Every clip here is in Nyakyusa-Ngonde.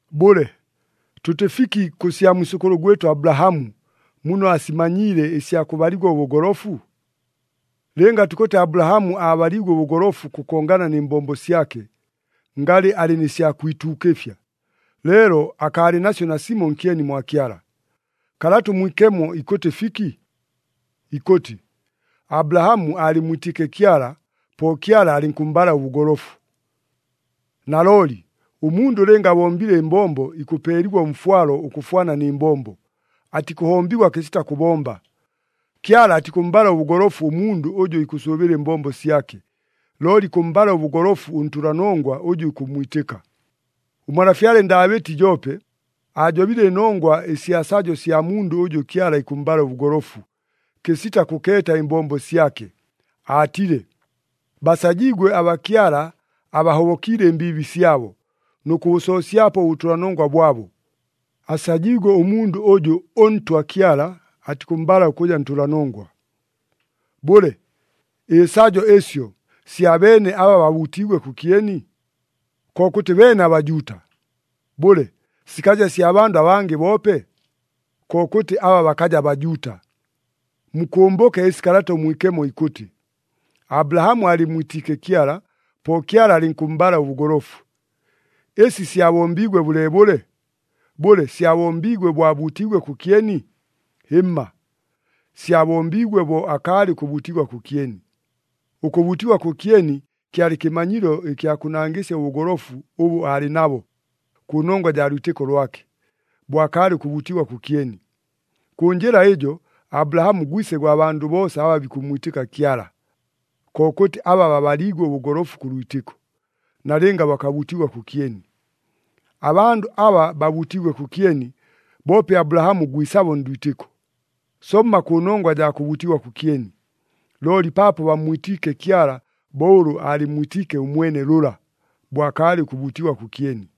Bʉle, tʉtɨ fiki kʉ sya mwisʉkʉlʉ gwɨtʉ Abulahamu, muno aasimanyiile ɨsya kʉbaligwa ʉbʉgolofu? Lɨnga tukʉtɨ Abulahamu aabaliigwe ʉbʉgolofu ʉkʉkongana nɨ mbombo syake, ngalɨ alɨ nɨ sya kwituukɨfya, leelo akaalɨ nasyo nasimo nkyeni mwa Kyala. Kalata ʉMwikemo ikʉtɨ fiki? Ikʉtɨ, “Abulahamu aalɨmmwitiike Kyala, po Kyala alɨnkʉmmbala ʉbʉgolofu.” Nalooli, ʉmundʉ lɨnga abombile ɨmbombo, ikʉpeeligwa ʉmfwalo ʉkʉfwana nɨ mbombo. Atikʉhombigwa kɨsita kʉbomba. Kyala atikʉmmbala ʉbʉgolofu ʉmundʉ ʉjʉ ikʉsʉʉbɨla ɨmbombo syake, looli ikʉmmbala ʉbʉgolofu ʉntʉlanongwa ʉjʉ ikʉmmwitɨka. Ʉmalafyale Ndaabɨti joope, aajobile ɨnongwa ɨsya sajo sya mundʉ ʉjʉ Kyala ikʉmmbala ʉbʉgolofu, kɨsita kʉkeeta ɨmbombo syake, aatile, “Basajiigwe aba Kyala abahobokiile ɨmbiibi syabo, nʉ kʉbʉsoosyapo ʉbʉtʉlanongwa bwabo. Asajiigwe ʉmundʉ ʉjʉ ʉNtwa Kyala atikʉmmbala ʉkʉja ntʉlanongwa.” Bʉle, ɨsajo ɨsyo, sya beene aba babuutiigwe kʉkyeni? Kokʉtɨ beene aBajuuta! Bʉle, sikaja sya bandʉ abangɨ boope? Kokʉtɨ aba bakaja Bajuuta! Mukʉmbʉke ɨsi Kalata ʉMwikemo ikʉtɨ, “Abulahamu aalɨmmwitiike Kyala, po Kyala alɨnkʉmmbala ʉbʉgolofu.” Ɨsi syabombiigwe bʉleebʉle? Bʉle, syabombiigwe bo abuutiigwe kʉkyeni? Hɨmma! Syabombiigwe bo akaalɨ ʉkʉbuutigwa kʉkyeni. Ʉkʉbuutigwa kʉkyeni kyalɨ kɨmanyilo ɨkya kʉnangɨsya ʉbʉgolofu ʉbʉ aalɨ nabo, kʉnongwa jaa lwitɨko lwake, bo akaalɨ ʉkʉbuutigwa kʉkyeni. Kʉ njɨla ɨjo Abulahamu gwise gwa bandʉ boosa aba bikʉmmwitɨka Kyala, kokʉtɨ aba babaliigwe ʉbʉgolofu kʉ lwitɨko, nalɨnga bakabuutigwa kʉkyeni. Abandʉ aba babuutiigwe kʉkyeni, boope Abulahamu gwisabo ndwitɨko, somma kʉnongwa jaa kʉbuutigwa kʉkyeni, looli paapo bammwitiike Kyala bo ʉlʉ aalɨmmwitiike ʉmwene lʉla, bo akaalɨ ʉkʉbuutigwa kʉkyeni.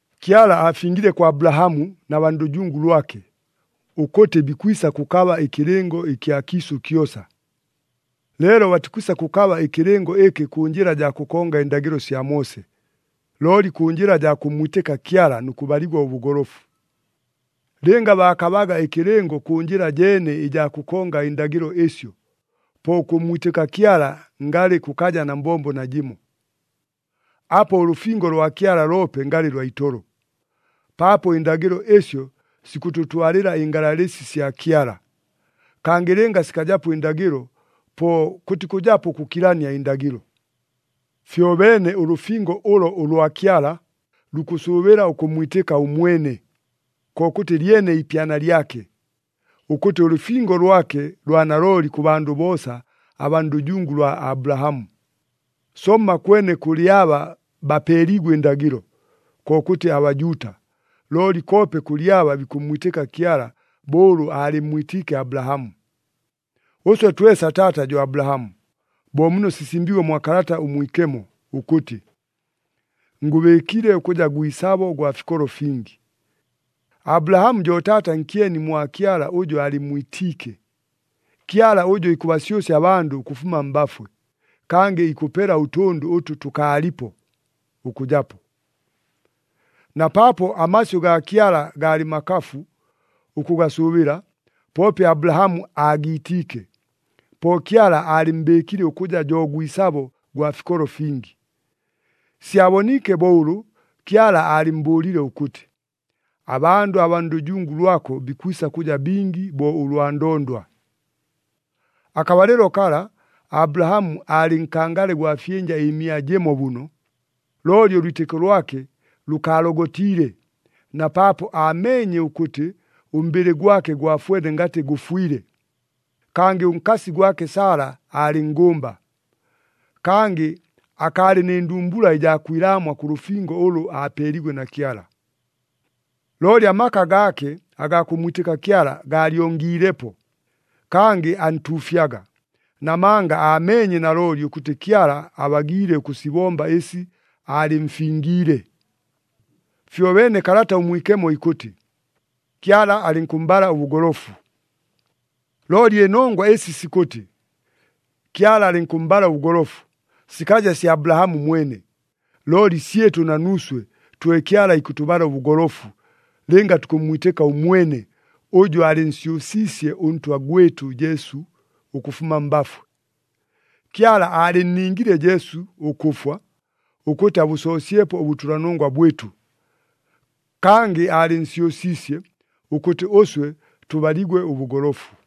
Kyala aafingile kwa Abulahamu na baa ndʉjungu lwake, ʉkʉtɨ bikwisa kʉkaba ɨkɨlɨngo ɨkya kiisʉ kyosa. Leelo batikwisa kʉkaba ɨkɨlɨngo ɨkɨ kʉ njɨla jaa kʉkonga ɨndagɨlo sya Moose, looli kʉ njɨla jaa kʉmmwitɨka Kyala nʉ kʉbaligwa ʉbʉgolofu. Lɨnga baakabaga ɨkɨlɨngo kʉ njɨla jeene ɨjaa kʉkonga ɨndagɨlo ɨsyo, po ʉkʉmmwitɨka Kyala ngalɨ kʉkaja na mbombo najɨmo. Apo ʉlʉfingo lwa Kyala loope ngalɨ lwa itolo, paapo ɨndagɨlo ɨsyo sikʉtʉtwalɨla ɨngalalɨsi sya Kyala. Kangɨ lɨnga sikajapo ɨndagɨlo, po kʉtikʉjapo ʉkʉkilania ɨndagɨlo. Fyobeene ʉlʉfingo ʉlo ʉlwa Kyala, lukʉsʉʉbɨla ʉkʉmmwitɨka ʉmwene, kokʉtɨ lyene iipyana lyake, ʉkʉtɨ ʉlʉfingo lwake lwa nalooli kʉ bandʉ boosa abaa ndʉjungu lwa Abulahamu. Somma kwene kʉlɨ aba bapeeliigwe ɨndagɨlo, kokʉtɨ aBajuuta, looli koope kʉlɨ aba bikʉmmwitɨka Kyala bo ʉlʉ aalɨmmwitiike Abulahamu. Ʉswe twesa taata jo Abulahamu, bo muno sisimbiigwe mwa Kalata ʉMwikemo ʉkʉtɨ, “Ngʉbɨɨkile ʉkʉja gwisabo gwa fikolo fingi.” Abulahamu jo taata nkyeni mwa Kyala ʉjʉ aalɨmmwitiike, Kyala ʉjʉ ikʉbasyʉsya abandʉ ʉkʉfuma mbafwe, kangɨ ikʉpela ʉtʉndʉ ʉtʉ tʉkaalipo, ʉkʉjapo. Na paapo amasyʉ gaa Kyala gaalɨ makafu ʉkʉgasʉʉbɨla, poope Abulahamu aagiitiike, po Kyala aalɨmmbɨɨkile ʉkʉja jo gwisabo gwa fikolo fingi. Syaboniike bo ʉlʉ Kyala aalɨmmbʉʉlile ʉkʉtɨ, “Abandʉ abaa ndʉjungu lwako bikwisa kʉja bingi bo ʉlwa ndondwa.” Akabalɨlo kala, Abulahamu aalɨ nkangale gwa fyɨnja ɨmia jɨmo bʉno. Looli ʉlwitɨko lwake lʉkaalogotiile, na paapo aameenye ʉkʉtɨ ʉmbɨlɨ gwake gwafwene ngatɨ gʉfwile, kangɨ ʉnkasi gwake Sala aalɨ nngʉmba. Kangɨ akaalɨ nɨ ndumbula ɨjaa kwilaamwa kʉ lʉfingo ʉlʉ aapeeliigwe na Kyala. Looli amaka gaake agaa kʉmmwitɨka Kyala gaalyongiilepo, kangɨ antuufyaga, namanga aameenye nalooli ʉkʉtɨ Kyala abagiile ʉkʉsibomba ɨsi aalɨmfingiile. Fyobeene Kalata ʉMwikemo ikʉtɨ, “Kyala alɨnkʉmmbala ʉbʉgolofu.” Looli ɨnongwa ɨsi sikʉtɨ, “Kyala alɨnkʉmmbala ʉbʉgolofu,” sikaja sya Abulahamu mwene, looli syɨtʉ na nuuswe, twe Kyala ikʉtʉbala ʉbʉgolofu, lɨnga tukʉmmwitɨka ʉmwene, ʉjʉ aalɨnsyʉsiisye ʉNtwa gwɨtʉ Jesu ʉkʉfuma mbafwe. Kyala aalɨnningile Jesu ʉkʉfwa, ʉkʉtɨ abʉsoosyepo ʉbʉtʉlanongwa bwɨtʉ. Kangɨ aalɨnsyʉsiisye, ʉkʉtɨ ʉswe tʉbaligwe ʉbʉgolofu.